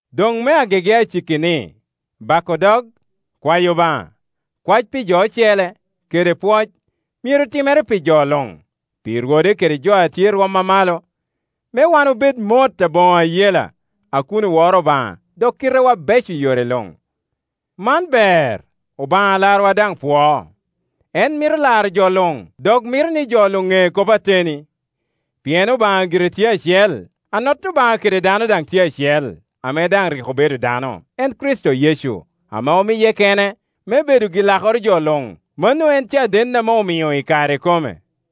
Doŋ me agege aciki ni, bako dog, kwayo Obaŋa, kwae pi jo ocele, kede pwoc, myero timere pi jo luŋ, pi rwode kede jo a tye i rwom a malo, me wan obed mot aboŋo ayela, a kun oworo Obaŋa dok kitewa beco i yore luŋ. Man ber, Obaŋa Alarwa daŋ pwoo. En mito laro jo luŋ, dok mito ni jo luŋ ŋe kop ateni. Pien Obaŋa gire tye acel, Anot Obaŋa kede dano daŋ tye acel, ame daŋ rik obedo dano, en Kricito Yecu, ame omiye kene me bedo gi-Iakoro jo luŋ; mano en caden ame omio i kare ikome.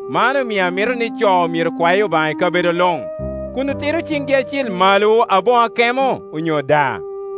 Man omio amito ni co myero kwa Obaŋa i kabedo luŋ, kun otiro ciŋgi acil malo aboŋo akemo onyo daa.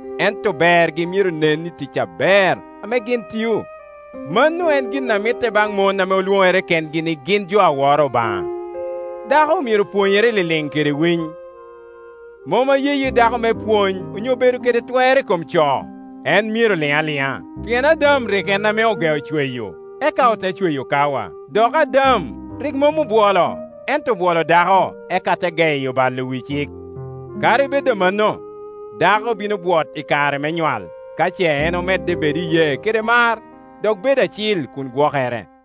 ento bergi myero nen i tic aber ame gin tio, mano en gin a mitte baŋ mon ame lwoŋere kengi ni gin jo a woro Obaŋa. Dako myero pwonyere liliŋ kede winy. Mom ayeyi dako me pwony onyo bedo i twer i kom co; en myero lin aliŋa. Pien Adam rik en ame ogeo cweyo, eka ote cweyo Kawa. Dok Adam rik mom obwolo, ento obwolo dako, eka te geyo kalo wi cik. Kadi bed amanno, dako bino bwot i kare me nywal, ka ce en omedde bedo i iyee kede mar, dok bedo acil kun gwokere.